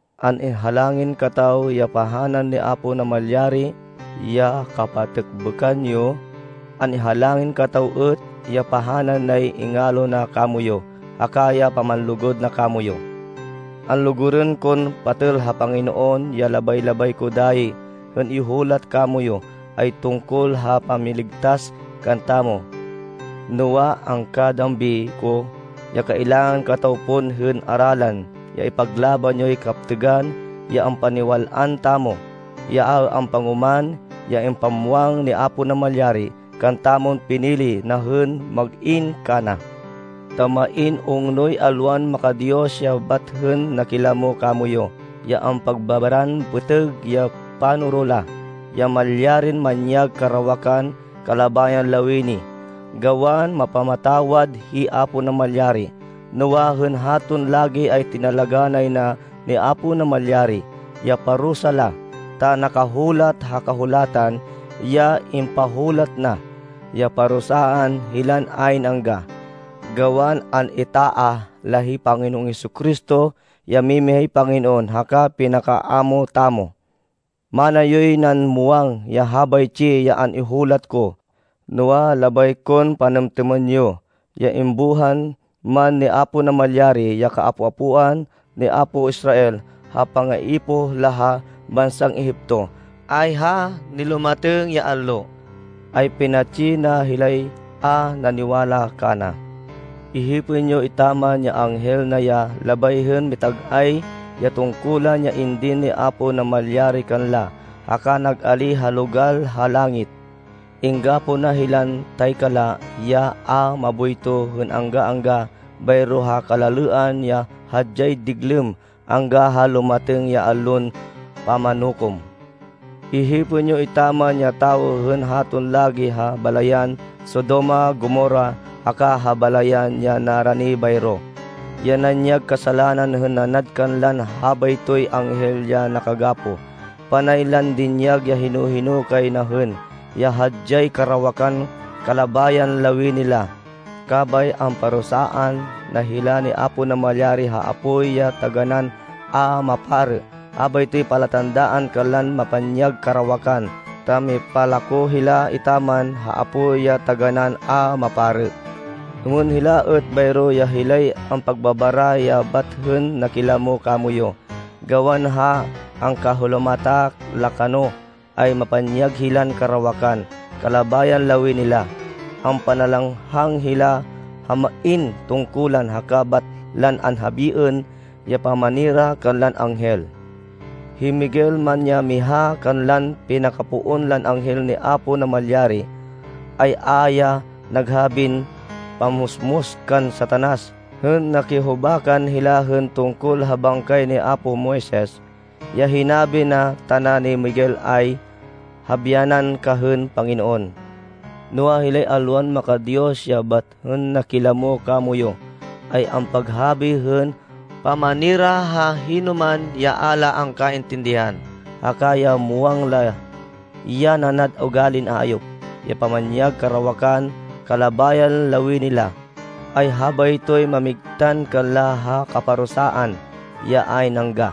An-ihalangin kataw ya pahanan ni Apo Namalyari ya kapatêkbêkan yo. An-ihalangin kataw êt ya pahanan nay ingalo na kamoyu haka ya pamanlugud na kamoyu. Anlugurên kon patêl ha Panginoon, ya labay-labay ko dayi hên ihulat kamoyu ay tungkol ha pamiligtas kantamo. Noa, angkadambi ko, ya kailangan kataw pon hên aralan ya ipaglaban yoy kaptêgan ya ampaniwal-an tamo, ya a ampangoman, ya impamwang ni Apo Namalyari kantamon pinili na hên mag-in kana. Ta main ungnoy alwan maka-Diyos ya bat hên nakilamo kamoyu ya ampagbabaran pêtêg ya panoro la, ya malyarin manyag karawakan kalabayan lawini, gawan mapamatawad hi Apo Namalyari. Noa, hên haton lagi ay tinalagá nay na ni Apo Namalyari ya parusa la, ta nakahulat ha Kahulatan ya impahulat na, ya parusaan hilan ayn angga, gawan an-itaah la hi Panginoon Jesu-Cristo ya mimihay Panginoon haka pinaka-Amo tamo. Mana yoy nan muwang ya habaytsi ya an-ihulat ko, noa, labay kon panêmtêmên yo, ya imbuhan man ni Apo Namalyari ya kaapo-apoan ni apo Israel ha pangaipoh la ha bansan Egipto, ay ha nilumatêng ya allo, ay pinatsi na hilay a naniwala kana. Ihipên yo etaman ya anghel na ya labay hên mitag-ay ya tungkulan ya indin ni Apo Namalyari kanla, haka nag-alíh ha logal la ha langit. Inggapoh na hilan taykala ya a maboyto hên angga-angga bayro ha kalalêan ya hadyay diglêm angga ha lumatêng ya Allon Pamanukom. Ihipên yo etaman ya tawo hên haton lagi ha balayan Sodoma, Gomorra haka ha balayan ya narani bayro, ya nanyag kasalanan hên nanad kanlan habaytoy anghel ya nakagapoh. Panay lan dinyag ya hino-hino kay na hên ya hadyay karawakan kalabayan lawini la, kabay amparusaan na hila ni Apo Namalyari ha apoy ya taganán a maparê. Habaytoy palatandaan kanlan mapanyag karawakan ta mipalako hila etaman ha apoy ya taganán a maparê. Êmên hila êt bayro ya hilay ampagbabara ya bat hên nakilamo kamoyu. Gawan ha angkahalomata la kano, ay mapanyag hilan karawakan kalabayan lawini la, ampanalanghang hila ha main tungkulan, haka bat lan anhabiên ya pamanira kanlan anghel. Hi Miguel man ya miha kanlan pinakapoon lan anghel ni Apo Namalyari, ay a ya naghabin pammusmus kan Satanas hên nakihubakan hila hên tungkol ha bangkay ni apo Moises. Ya hinabi na tana ni Miguel ay, “Habyanan ka hên Panginoon!” Noa, hilay alwan maka-Diyos ya bat hên nakilamo kamoyu, ay ampaghabi hên pamanira ha hinoman ya a la angkaintindihan. Haka ya muwang la, ya nanad ugalin ayop, ya pamanyag karawakan kalabayan lawini la, ay habaytoy mamigtan kanla ha kaparusaan ya ayn angga.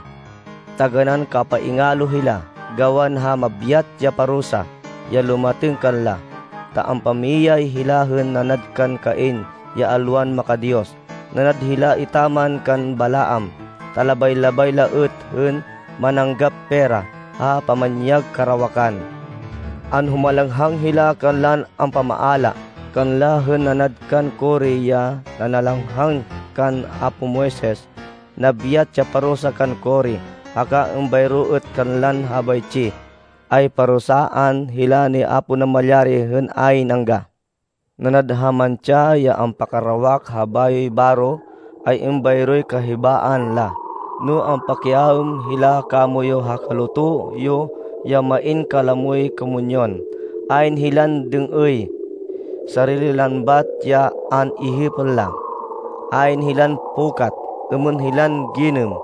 Taganán kapaingalo hila, gawan ha mabyat ya parusa ya lumatêng kanla! Ta ampamiyay hila hên nanad kan Cain ya alwan maka-Diyos. Nanad hila etaman kan Balaam, ta labay-labay la êt hên mananggap pera ha pamanyag karawakan. Anhumalanghang hila kanlan ampamaala kanla hên nanad kan Core ya nanalanghang kan apo Moises. Nabyat ya parusa kan Core, haka êmbayro êt kanlan habaytsi, ay parusaan hila ni Apo Namalyari hên ayn angga. Nanad ha mantsa ya ampakarawak ha bayoy baro, ay êmbayroy kahibaan la no ampakiaêm hila kamoyu ha kaluto yo ya main kalamoy komunyon. Ayn hilan dêng-êy. Sarili lan bat ya an-ihipên la. Ayn hilan pukat. Êmên hilan ginêm,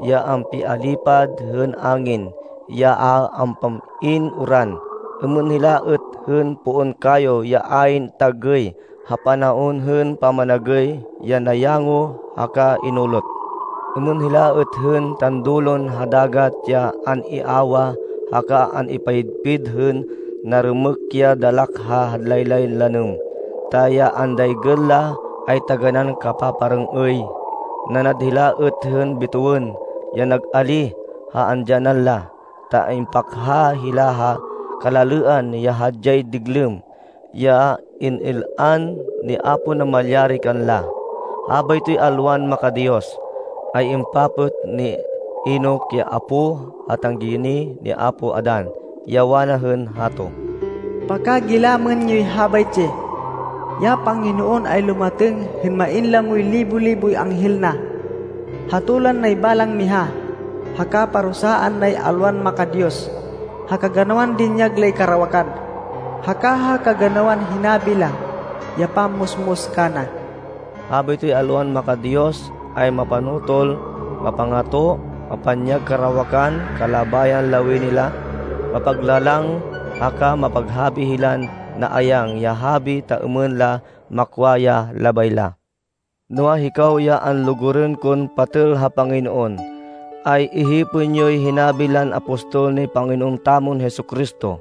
ya ampialipad hên angin, ya a ampam-in uran. Êmên hila êt hên poon kayo ya ayn tagêy ha panaon hên pamanagêy, ya nayango haka inulot. Êmên hila êt hên tandulon ha dagat ya an-iawah haka an-ipayidpid hên narêmêk ya dalak ha laylay lanêm, ta ya andaygên la ay taganán kapaparêng-êy. Nanad hila êt hên bêtêwên, ya nag-alíh ha andyanan la, ta ampakha hila ha kalalêan ya hadyay diglêm, ya in-il-an ni Apo Namalyari kanla. Habaytoy alwan maka-Diyos, ay impapêt ni Enoc ya apó ha tanggiginih ni apo Adan, ya wana hên hato, “Pakagilamên yoy habaytsi! Ya Panginoon ay lumatêng hên main lamoy libo-liboy anghel na. Hatolan nay balang miha, haka parusaan nay alwan maka-Diyos ha kaganawan dinyag lay karawakan, haka ha kaganawan hinabi la ya pammusmus kana.” Habaytoy alwan maka-Diyos, ay mapanotol, mapangato, mapanyag karawakan kalabayan lawini la, mapaglalang, haka maghabi hilan naayang ya habi ta êmên la makwa ya labay la. Noa, hikaw ya anlugurên kon patêl ha Panginoon, ay ihipên yoy hinabi lan apostol ni Panginoon tamon Jesu-Cristo.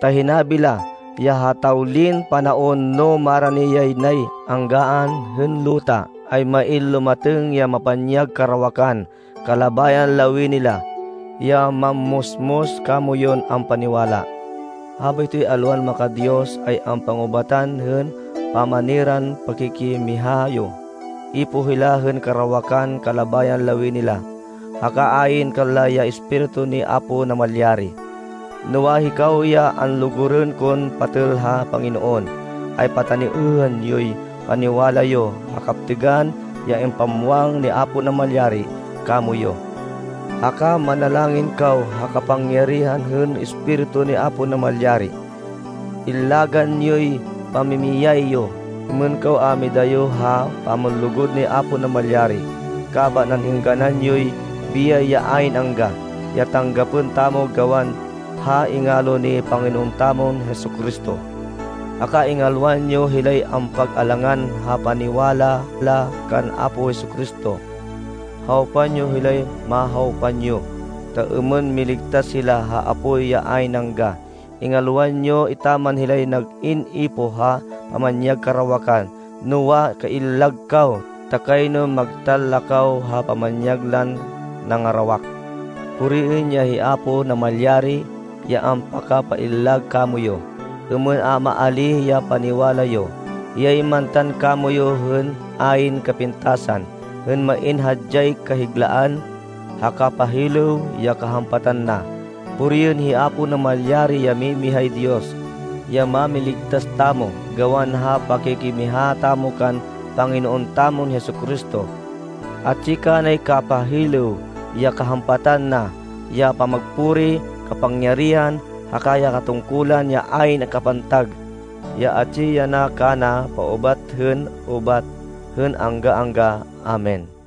Ta hinabi la, ya ha tawlin panaon, no marani yanay anggaan hên luta, ay main lumatêng ya mapanyag karawakan kalabayan lawini la, ya mammusmus kamoyun ampaniwala. Habaytoy alwan maka-Diyos, ay ampangubatan hên pamaniran pakikimiha yo. Ipoh hila hên karawakan kalabayan lawini la, haka ayn kanla ya Espiritu ni Apo Namalyari. Noa, hikaw, ya anlugurên kon patêl ha Panginoon, ay pataniêhên yoy paniwala yo ha kaptêgan ya impamwang ni Apo Namalyari kamoyu. Haka manalangin kaw ha kapangyarihan hên Espiritu ni Apo Namalyari. Illagan yoy pamimiyay yo êmên kaw a midayo ha pamanlugud ni Apo Namalyari, kaban an-êngganan yoy biyay ya ayn angga, ya tanggapên tamo gawan ha ingalo ni Panginoon tamon Jesu-Cristo. Haka ingalwan yo hilay ampag-alangan ha paniwala la kan Apo Jesu-Cristo. Hawpan yo hilay mahawpan yo, ta êmên miligtas hila ha apoy ya ayn angga. Ingalwan yo etaman hilay nag-in ipoh ha pamanyag karawakan, noa, kaillag kaw ta kayno magtan la kaw ha pamanyag lan nangarawak. Puriên ya hi Apo Namalyari, ya ampakapaillag kamoyu, êmên a maalíh ya paniwala yo. Hiyay mantan kamoyu hên ayn kapintasan, hên main hadyay kahiglaan, ha kapahilêw ya kahampatan na. Puriên hi Apo Namalyari, ya mimihay Diyos, ya Mámiligtas tamo gawan ha pakikimiha tamo kan Panginoon tamon Jesu-Cristo. Atsi kanay kapahilêw ya kahampatan na, ya pamagpuri, kapangyarihan haka ya tungkulan ya ayn kapantag, ya atsi yana kana paubat hên ubat, hên angga-angga! Amen.